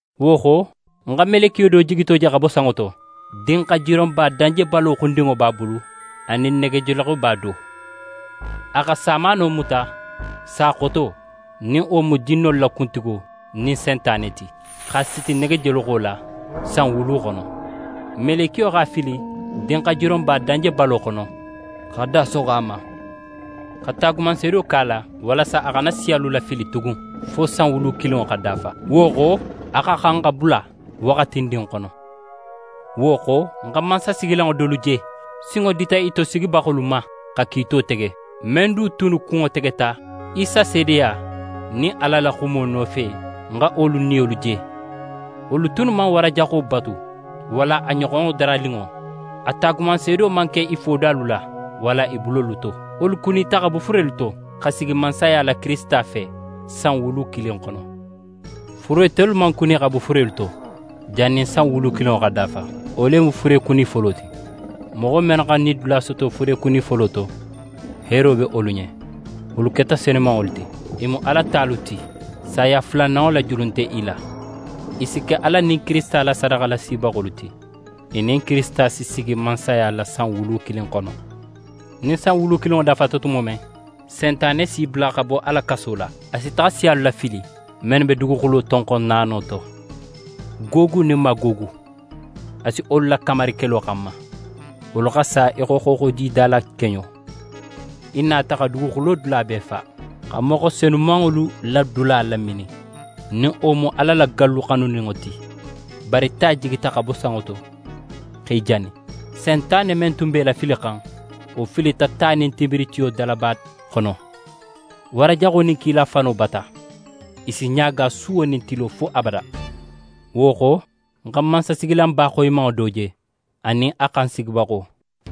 Wo xo, ń xa melekiyo do jigito je xa bo sanŋo to. Dinxajironba danjebalo xundinŋo b'a bulu anin negejoloxoba do. A xa samaano muta, sa xoto, nin wo mu jinnolu la kuntigo nin Sentane ti, x'a siti negejoloxo la san wulu xono. Melekiyo x'a fili dinxajironba danjebalo xono x'a da soxo a ma, xa taagumanseedo ke a la, walasa a xana siyalu lafili tugun fo san wulu kilinŋo xa dafa. Wo xo, a xa xan xa bula waxatindin xono. Wo xo, ń xa mansasigilanŋo dolu je, sinŋo dita i tosigibaxolu ma xa kiito tege. Men du tunnu kunŋo tegeta Isa seedeya nin Ala la xumo nofe, ń xa wolu niyolu je. Wolu tunnu man wara jaxo batu walla a ɲoxonɲo daraninŋo, a taagumanseedo man ke i fodalu la walla i bulolu to. Wolu kunita xa bo furelu to, xa sigi mansaya la Kirisita fe, san wulu kilin xono. Fure tolu man kuni xa bo furelu to, jannin san wulu kilinŋo xa dafa. Wo le mu furekuni folo ti. Moxo mennu xa nidula soto furekuni folo to, heero be wolu ɲen, wolu keta senumanŋolu ti. I mu Ala talu ti, saya fulananŋo la julu nte i la. I si ke Ala nin Kirisita la sadaxalasibaxolu ti. I nin Kirisita si sigi mansaya la san wulu kilin xono. Nin san wulu kilinŋo dafata tumo men, Sentane si bula xa bo a la kaso la. A si taxa siyalu lafili, mennu be duguxulo tonxon naano to, Gogu nin Magogu. A si wolu lakamari kelo xanma. Wolu xa sa í xo xooxojida la keɲo. I nata xa duguxulo dula bee fa, xa moxo senumanŋolu la dula laminin, nin wo mu Ala la gallu xanuninŋo ti. Bari ta jigita xa bo sanŋo to x'e jani. Sentane men tun b'e lafilixan, wo filita ta nin tinbiritiyo dalaba xono, wara jaxo nin kila fano bata. I si ɲaaga suwo nin tilo fo abada. Wo xo, ń xa mansasigilanba xoyimanŋo do je, anin a xan sigibaxo.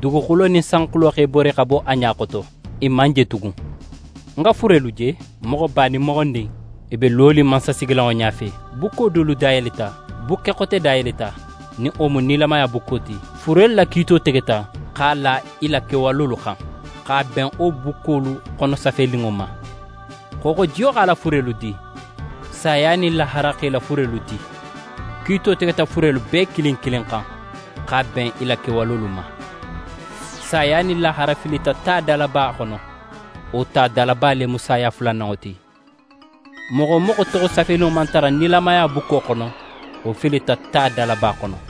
Duguxulo nin sanxulo x'e bori xa bo a ɲa xoto, i man je tugun. Ń xa furelu je, moxoba nin moxondin, i be lonin mansasigilanŋo ɲafe. Bukko dolu dayeleta. Bukke xote dayeleta, nin wo mu nilamaya bukko ti. Furelu la kiito tegeta x'a la i la kewalolu xan, x'a ben wo bukkolu xono safeninŋo ma. Xooxojiyo x'a la furelu di. Saya nin lahara x'e la furelu di. Kiito tegeta furelu bee kilin kilin xan, x'a ben i la kewalolu ma. Saya nin lahara filita ta dalaba xono. Wo ta dalaba le mu saya fulananŋo ti. Moxo wo moxo toxo safeninŋo man tara nilamaya bukko xono, wo filita ta dalaba xono.